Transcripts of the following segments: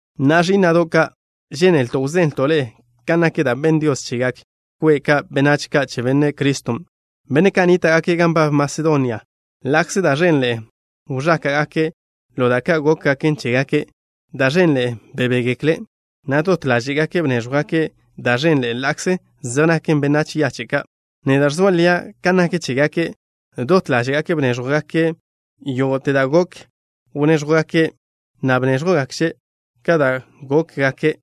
Na'a, ẕí'na'do' ka', žénelto' wzenlto' ḻe'e kan nak da' benn Dios chegak kwe' ka' benách ka' che Benne' Criston', benne' ka' nníta'gake' gan nbab Masedonia. Ḻa'kze da' ẕenḻe'e wẕáka'gake' ḻo da' ka' gókgaken chégake', da' ẕenḻe'e bebégekle', na' dot ḻáže'gake' bnéẕjwgake' da' ẕenḻe'e ḻa'kze zej nake' benách yache' ka'. Neda' ẕzoa lia' kan nak chégake', dot ḻáže'gake' bnéẕjwgake' yógo'te da' gok wnéẕjwgake', na' bnéẕjwgakže' ka da' gókgake'.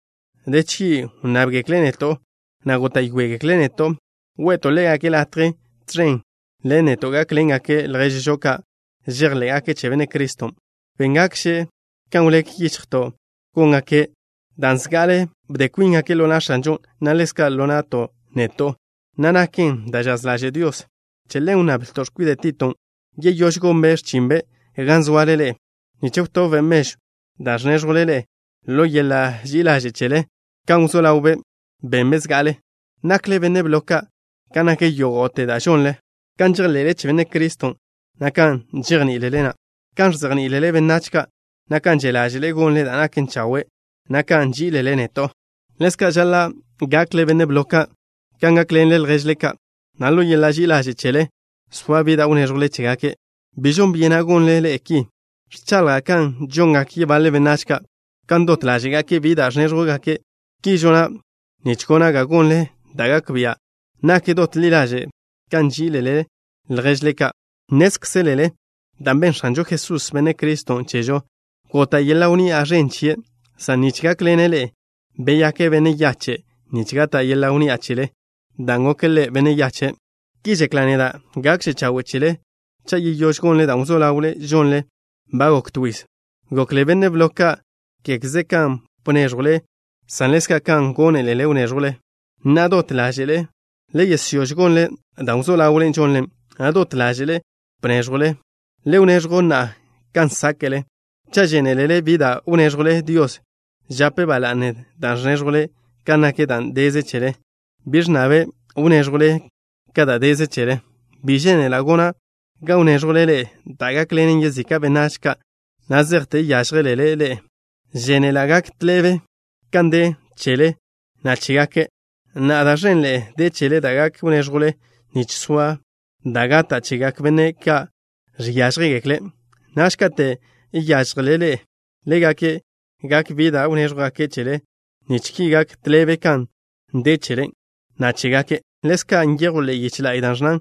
De chgi' wnnábgekle' neto', na' góta'yoeḻe'egekle' neto' we'to' ḻégake' latje tẕen ḻen neto' gákḻengake' lježžo ka' žejḻé'gake' che Benne' Criston'. Béngakže' kan wlék yichjto' góngake', dan' zga'ale bde kwíngake' ḻo na' X̱anžon', na' ḻezka' ḻo na'to' neto', na' naken da' žaz ḻaže' Dios. Che ḻen wnnablto' x̱kwide' Titon' yeyóž gonbe' x̱chinbe' gan zoale ḻe'e, nich wtobbe' mežw da' ẕnéẕjwle ḻe'e ḻo yeḻa' ži'i ḻaže' chele, kan wzó ḻawbe' benbe' zga'ale. Nakle benne' blo ka' kan nak yógo'te da' žonle, kan žejḻe'le che Benne' Criston', na' kan žejní'ilele, na' kan ẕzejní'ilele benách ka', na' kan že' ḻáže'le gonle da' naken chawe', na' kan nží'ilele neto'. Ḻezka' žaḻa' gakle benne' blo ka' kan gákḻenle lježle ka', na' ḻo yeḻa' ži'i ḻaže' chele soa bi da' wnéẕjwle chégake'. Bi žon byena' gonle ḻe'e ki. Ẕchaḻja' kan žongak yebaḻe benách ka', kan dot ḻáže'gake' bi da' ẕnéẕjwgake'. Ki žona' nich gona' ga gonle da' gak bia' nak dot ḻi ḻaže' kan nží'ilele lježle ka'. Nnézkzelele da' benn X̱anžo Jesús, Benne' Criston', chežo. Gota' yeḻa' wnni'a ẕen chie', san nich gákḻene' ḻe'e beyake' benne' yache' nich gata' yeḻa' wnni'a chele, dan' goke' Ḻe' yache'. Ki žekla' neda': gakže chawe' chele cha' yeyóž gonle da' wzó ḻawle žonle ba gok to yiz. Gokle benne' blo ka', kégeze kan bnéẕjwle, san ḻezka' kan gónelele wnéẕjwle. Na'a, dot ḻáže'le le yesyóž gonle dan' wzó ḻawle žonle, na' dot ḻáže'le bnéẕjwle. Le wneẕjw na'a kan sáke'le. Cha' žénelele bi da' wnéẕjwle, Dios žape' ba la'ne da' ẕnéẕjwle kan nak da' deze chele. Bi ẕnnabe' wnéẕjwžele ka da' deze chele. Bi žénela' gona' ga wnéẕjwle ḻe'e da' gákḻenen yezika' benách ka' na' zejte yážjelele ḻe'e. Žénela' gak tḻebe kan de chele, na' chégake'. Na'a da' ẕenḻe'e de chele da' gak wnéẕjwle nich soa da' gata' chegak benne' ka' žiážjegekle'. Naž kate' yážjelele ḻe'e, ḻégake' gak bi da' wnéẕjwgake' chele nich ki gak tḻebe kan de chele, na' chégake'. Ḻezka' nyejw ḻe'e yiche la'y, da' ẕnnan: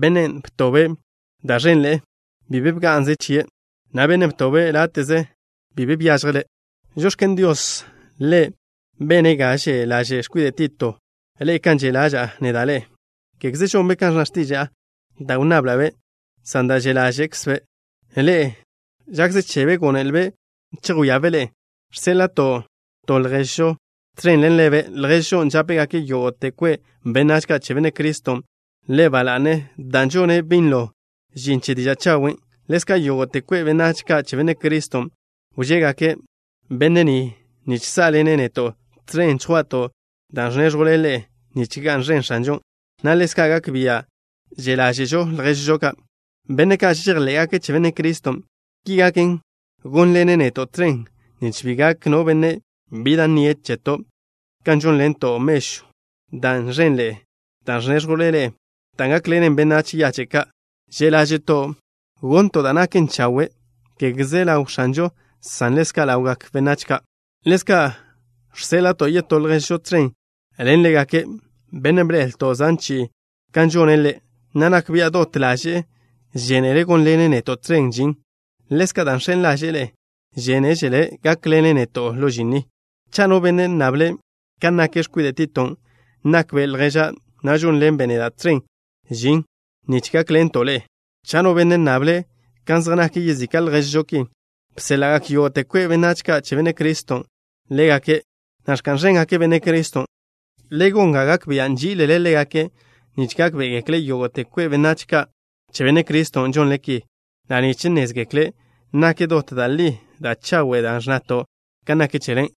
“Bennen' btobe' da' ẕenḻe'e, bi be bga'nze chie', na' bennen' btobe' láte'ze, bi be byážjele'.” Žox̱ken Dios, Ḻe' bene' ga že' ḻaže' x̱kwide' Tito ḻe'e kan že' ḻaža'a neda' ḻe'e. Kégeze žonbe' kan ẕnna x̱tiža'a da' wnnabla'-be', san dan' že' ḻáže'kzbe' ḻe'e, žakze chebe' gónelbe' chejwíabe' ḻe'e. Žséḻa'to' to lježžo tẕen ḻen ḻebe', lježžon' žápegak yógo'te kwe' benách ka' che Benne' Criston' ḻe' ba la'ne, dan' žone' binlo žin che diža' chawen'. Ḻezka' yógo'te kwe' benách ka' che Benne' Criston' wžegak benne' ni nich sá'ḻene' neto' tẕen chjwa'to' dan' ẕnéẕjwle ḻe'e nich ga'n ẕen X̱anžon', na' ḻezka' gak bia' že' ḻáže'žo lježžo ka', benne' ka' žejḻé'gake' che Benne' Criston'. Ki gaken, gónḻene' neto' tẕen nich bi gak no benne' bi da' nnie' cheto' kan žónḻento' mežwn' da' ẕenḻe'e da' ẕnéẕjwle ḻe'e, da' gákḻenen benách yache' ka'. Že' ḻáže'to' gonto' da' naken chawe', kégeze ḻaw X̱anžon', san ḻezka' ḻawgak benách. Ḻezka' žséḻa'to' yetó lježžo tẕen ḻen ḻégake', bennen' bḻe'elto' zan chi'i kan žone' ḻe', na' nak bia' dot ḻaže'e žénele' gónḻene' neto' tẕen žin. Ḻezka', dan' žx̱en ḻaže'e ḻe'e, žénežele' gákḻene' neto' ḻo žin ni. Cha' no benne' nnable' kan nak x̱kwide' Titon', nakbe' lježa', na' žónḻenbe' neda' tẕen žin nich gákḻento' ḻe'e. Cha' no benne' nnable' kan zej nak yezika' lježžo ki, bséḻa'gak yógo'te kwe' benách ka' che Benne' Criston' ḻégake', na' ẕka'n ẕéngake' Benne' Criston'. Le gon ga gak bia' nží'ilele ḻégake' nich gákbe'egekle yógo'te kwe' benách ka' che Benne' Criston' žonle ki, na' nich nnézgekle' nak dot da' li da' chawe' da' ẕnnato' kan nak chele.